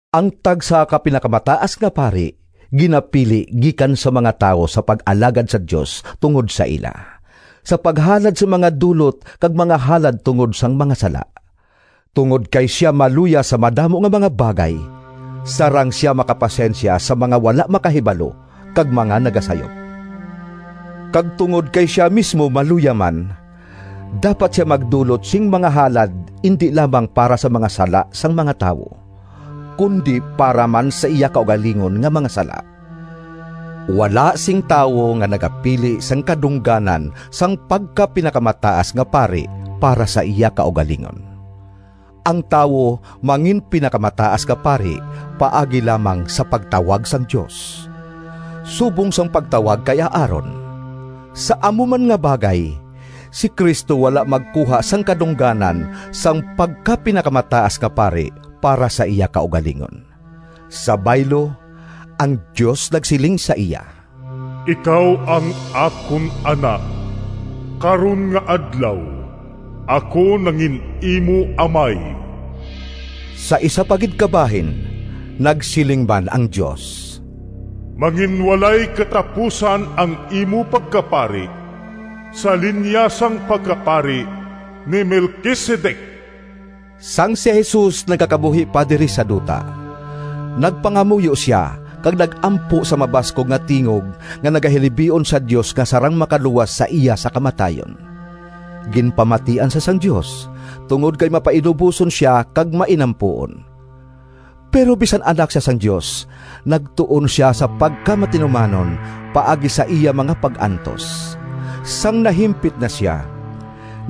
Ang tagsa ka pinakamataas nga pari ginapili gikan sa mga tawo sa pag-alagad sa Dios tungod sa ila, sa paghalad sing mga dulot kag mga halad tungod sang mga sala. Tungod kay sia maluya sa madamo nga mga bagay, sarang sia makapasensya sa mga wala makahibalo kag mga nagasayop. Kag tungod kay sia mismo maluya man, dapat sia magdulot sing mga halad indi lamang para sa mga sala sang mga tawo, kundi para man sa iya kaugalingon nga mga sala. Wala sing tawo nga nagapili sang kadungganan sang pagkapinakamataas nga pari para sa iya kaugalingon. Ang tawo manginpinakamataas nga pari paagi lamang sa pagtawag sang Dios, subong sang pagtawag kay Aaron. Sa amo man nga bagay, si Cristo wala magkuha sang kadungganan sang pagkapinakamataas nga pari para sa iya kaugalingon. Sa baylo, ang Dios nagsiling sa iya: “Ikaw ang akon Anak, Karon nga adlaw Ako nangin-imo Amay.” Sa isa pa gid ka bahin nagsiling man ang Dios: “Manginwalay katapusan Ang imo pagkapari, Sa linya sang pagkapari Ni Melquisedec.” Sang si Jesus nagakabuhi pa diri sa duta, nagpangamuyo sia kag nag-ampo sa mabaskog nga tingog nga nagahilibion sa Dios nga sarang makaluwas sa iya sa kamatayon. Ginpamatian sia sang Dios, tungod kay mapainuboson sia kag mainampuon. Pero bisan Anak sia sang Dios, nagtuon sia sa pagkamatinumanon paagi sa iya mga pag-antos. Sang nahimpit na sia,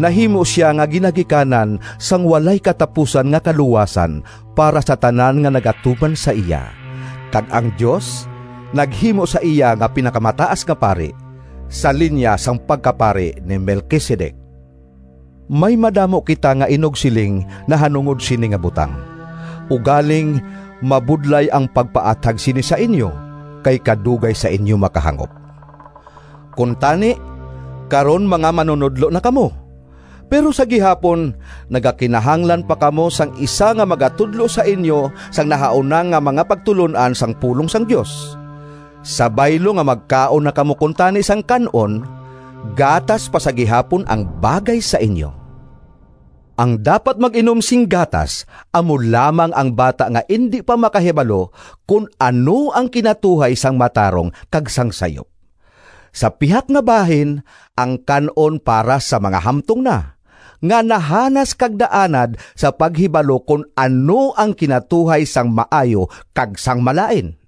nahimo sia nga ginagikanan sang walay katapusan nga kaluwasan para sa tanan nga nagatuman sa iya, kag ang Dios naghimo sa iya nga pinakamataas nga pari, sa linya sang pagkapari ni Melquisedec. May madamo kita nga inugsiling nahanungod sini nga butang, ugaling mabudlay ang pagpaathag sini sa inyo, kay kadugay sa inyo makahangop. Kuntani karon mga manunodlo na kamo, pero sa gihapon nagakinahanglan pa kamo sang isa nga magatudlo sa inyo sang nahauna nga mga pagtulon-an sang pulong sang Dios. Sa baylo nga magkaon na kamo kuntani sang kan-on, gatas pa sa gihapon ang bagay sa inyo. Ang dapat mag-inom sing gatas amo lamang ang bata nga indi pa makahibalo kon ano ang kinatuhay sang matarong kag sang sayop. Sa pihak nga bahin, ang kan-on para sa mga hamtong na, nga nahanas kag naanad sa paghibalo kon ano ang kinatuhay sang maayo kag sang malain.